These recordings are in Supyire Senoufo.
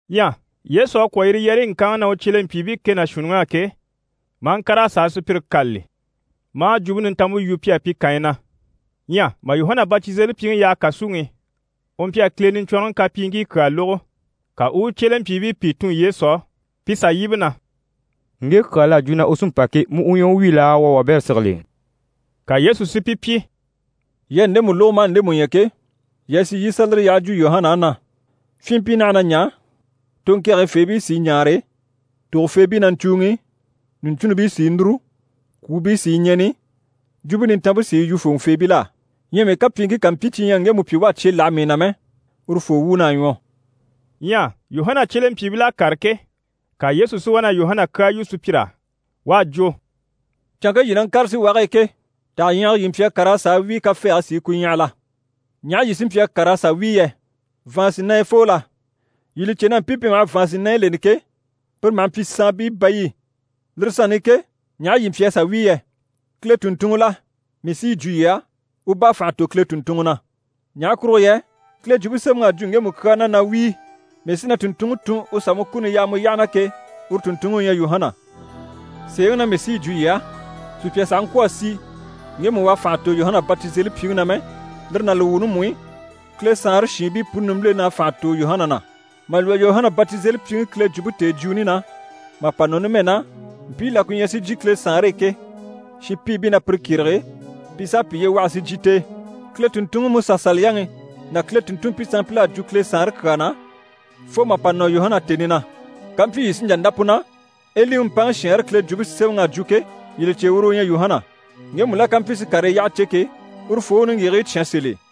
Ɲyɛ Yesu à kwɔ̀ yire yɛrɛyi ŋkanŋi na u cyelempyiibii kɛ ná shuunniŋ'á ke, maa ŋkàr'a sà a sùpyire kâlali, maa Jwumpe Nintanmpe yu pi á pi kànyi na. Ɲyɛ mà Yuhana Batizelipyiŋi yaha kàsuŋi i, u mpyi a Kile Niɲcwɔnrɔŋi kapyiiŋkii kyaa lógo. Ka u u u cyelempyiibii pìi tun Yesu á pi sà yíbe na: «Ŋge kyaa l'à jwo na u sí n‑pa ke, mu u ɲyɛ u wi laa, wuu a wabɛrɛ sigili?» Ka Yesu si pi pyi: «Yii à ndemu lógo maa ndemu ɲya ke, yii a sì, yii i sà lire yyaha jwo Yuhana á na “Fyinmpii naha na ɲaa, toŋkɛgɛyifeebii sí i ɲaare, tògofeebii na ɲcùuŋi, ɲùɲcunnibii sí i núru, kwùubii sí i ɲɛ̀ni, Jwumpe Nintanmpe sí i yu fòŋɔfeebil'á. Ɲyɛ mii kapyiiŋkii ká mpyi cyi ɲyɛ a ŋgemu pyi u à cye láha mii na mɛ, urufoo wuun'à ɲwɔ.”» Ɲyɛ Yuhana cyelempyiibil'à kàre ke, ka Yesu si wá na Yuhana kyaa yu sùpyir'á, u à jwo: «Canŋke yii ná ŋkàre síwage e ke, taha ɲyɛgɛ yii mpyi a kàr'a sà wíi kafɛɛge sí i ku ɲyàha la? Ɲaha yii sí mpyi a kàr'a sà wíi yɛ? Vàansinayafoo la? Yii li cè na mpii pi maha vàansinayi leni ke, pire maha mpyi saanbii bayi i. Lire sanni i ke, ɲaha yii mpyi a sà wíi yɛ? Kile tùnntunŋɔ la? Mii sí yi jwo yii á, u bá à fànha tò Kile tùnntunŋɔ na. Ɲaha kurugo yɛ Kile Jwumpe Semɛŋi à jwo ŋgemu kyaa na na “Wíi, mii sí na tùnntunŋi tun u sà mu kuni yaa mu yyaha na” ke, uru tùnntunŋi u ɲyɛ Yuhana. Sèeŋi na mii sí yi jwo yii á, sùpya sàha ŋkwɔ̀ a si ŋgemu u à fànha tò Yuhana Batizelipyiŋi na mɛ, lire ná li wuuni mú i, Kile Saanre shiinbii puni nimbilen'à fànha tò Yuhana na. Mà lwɔ́ Yuhana Batizelipyiŋi Kile jwumpe tèejwuuni na, mà pa nɔ numɛ na, mpii la ku ɲyɛ si jyè Kile Saanre e ke, shinpiibii na pire kyérege, pi s'à piye waha si jyè t'e. Kile tùnntunŋi MusaSaliyaŋi ná Kile tùnntunmpii sanmpil'à jwo Kile Saanre kyaa na, fo mà pa nɔ Yuhana tèni na. Kampyi yii sí n‑jà n‑dá pu na, Eliŋi mpaŋi shɛɛnre Kile Jwumpe Semɛŋi a jwo ke, yii li cè uru u ɲyɛ Yuhana. Ŋgemu la ká mpyi si karii yyaha cè ke, urufoo u u niŋgyigigii cyán sèl'e.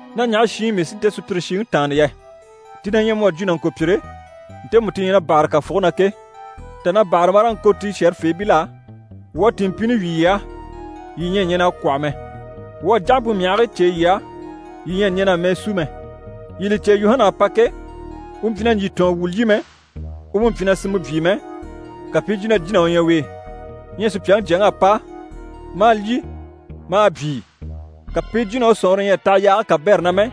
Ná ɲaha shi i mii sí nte sùpyire shiŋi tàanna yɛ? Ti na ɲyɛ mu à jwo nàŋkopyire, ntemu ti ɲyɛ na bâhare kàfuge na ke, tà na bâhare maa ŋko ti shɛ̀rɛfeebil'á “Wuu à tìinmpini wyì yii á, yii ɲyɛ a ɲɛn'a kwɔ̂hɔ mɛ. Wuu à jáhampe myahigii cêe yii á, yii ɲyɛ a ɲɛn'a mɛɛ sú mɛ.” Yii li cè, Yuhana à pa ke, u mpyi na ɲjyìtɔɔn wu lyî mɛ, u mú mpyi na sinmɛ byii mɛ, ka pi i jwo na jína u ɲyɛ u e. Ɲyɛ Supyaŋi Jyaŋi à pa, maa lyî maa byii, ka pi i jwo na u sɔ̀nŋɔre ɲyɛ a taha yaage kabɛrɛ na mɛ,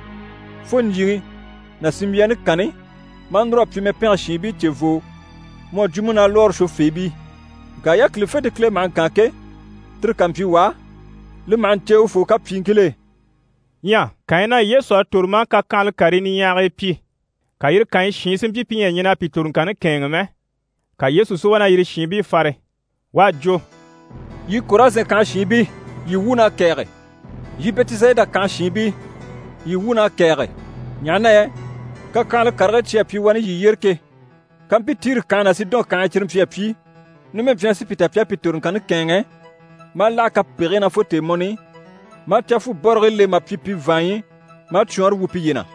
fo ɲjyìŋi ná sinmbyaani kanni, maa núr'a pyi mɛpɛngɛ shiinbii cevoo mu à jwo múnalwɔɔre shwofeebii. Ŋka yákilifente Kile maha ŋkaan ke, tire ká mpyi wà á, li maha ɲcè urufoo kapyiiŋkil'e.» Ɲyɛ kànyi na Yesu à tòro maa kakyanhala karii niɲyahagii pyi, ka yire kànyi shiin si mpyi pi ɲyɛ a ɲɛn'a pi toroŋkanni kɛ̂ɛnŋɛ mɛ, ka Yesu si wá na yire shiinbii fare. U à jwo: «Yii Korazɛn kànhe shiinbii, yii wuun'à kɛ̀ɛge! Yii Bɛtisayida kànhe shiinbii, yii wuun'à kɛ̀ɛge! Ɲaha na yɛ kakyanhala karigii cyi à pyi wani yii yyére ke, kampyi Tiri kànhe ná Sidɔn kànhe e, cyire mpyi a pyi, numɛ mpyi na sí pi ta pi à pi toroŋkanni kɛ̂ɛnŋɛ maa láha kapegigii na fo tèemɔni i, maa cafubɔrigii le mà pyi pi vàanɲyi, maa cwɔɔnre wu piye na.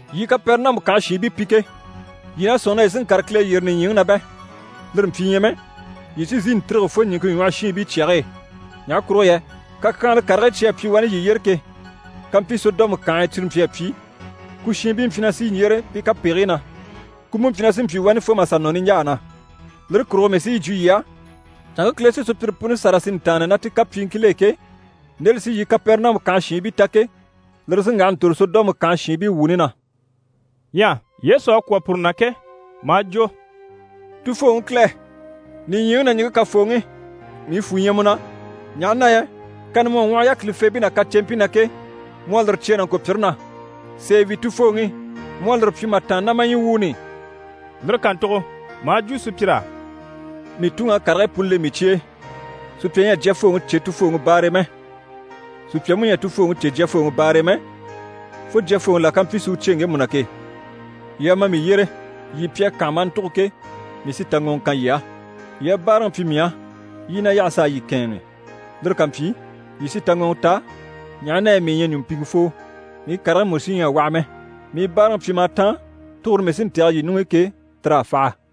Yii Kapɛrɛnamu kànhe shiinbii pi ke, yii na sɔ̂nŋi na yii sí n‑kàre Kile yyére nìɲyiŋi na bɛ? Lire mpyi ɲyɛ mɛ, yii sí n‑sìi n‑tîrige fo ɲìŋke ɲwɔhɔ shiinbii cyage e. Ɲaha kurugo yɛ kakyanhala karigii cyi à pyi wani yii yyére ke, kampyi Sɔdɔmu kànhe e cyire mpyi a pyi, ku shiinbii mpyi na sí n‑yyére pi kapegigii na. Ku mú mpyi na sí n‑pyi wani fo mà sà nɔ niɲjaa na. Lire kurugo mii sí yi jwo yii á, canŋke Kile sí sùpyire puni sâra si ntàanna ná ti kapyiiŋkil'e ke, nde li sí yii Kapɛrɛnamu kànhe shiinbii ta ke, lire sí n‑waha n‑tòro Sɔdɔmu kànhe shiinbii wuuni na.» Ɲyɛ Yesu à kwɔ̀ puru na ke, maa jwo: «Tufooŋi Kile, nìɲyiŋi ná ɲìŋke Kafooŋi, mii fwù ɲyɛ mu na, ɲaha na yɛ kani mu à ŋwɔhɔ yákilifeebii ná kaceempii na ke, mu à lire cyêe nàŋkopyire na. Sèe wi, Tufooŋi, mu à lire pyi mà tàanna ná ma ɲyii wuuni i.» Lire kàntugo maa jwo sùpyir'á: «Mii Tuŋi à karigii puni le mii cye e. Sùpya ɲyɛ a Jyafooŋi cè Tufooŋi baare e mɛ. Sùpya mú ɲyɛ a Tufooŋi cè Jyafooŋi baare e mɛ, fo Jyafooŋi la ká mpyi si u cyêe ŋgemu na ke. Yii a ma mii yyére, yii pi à kànha maa ntugo ke, mii sí taŋɔŋɔ kan yii á. Yii a báaraŋi pyi mii á, yii i na yaha s'a yii kɛ̂ɛnŋi. Lire ká mpyi, yii sí taŋɔŋɔ ta, ɲaha na yɛ mii ɲyɛ ɲùmpiŋɛfoo, mii karigii mú sí ɲyɛ a waha mɛ. Mii báaraŋi pyim'à táan, tugure mii sí n‑tɛ̀gɛ yii ɲuŋ'i ke, tir'à faha.»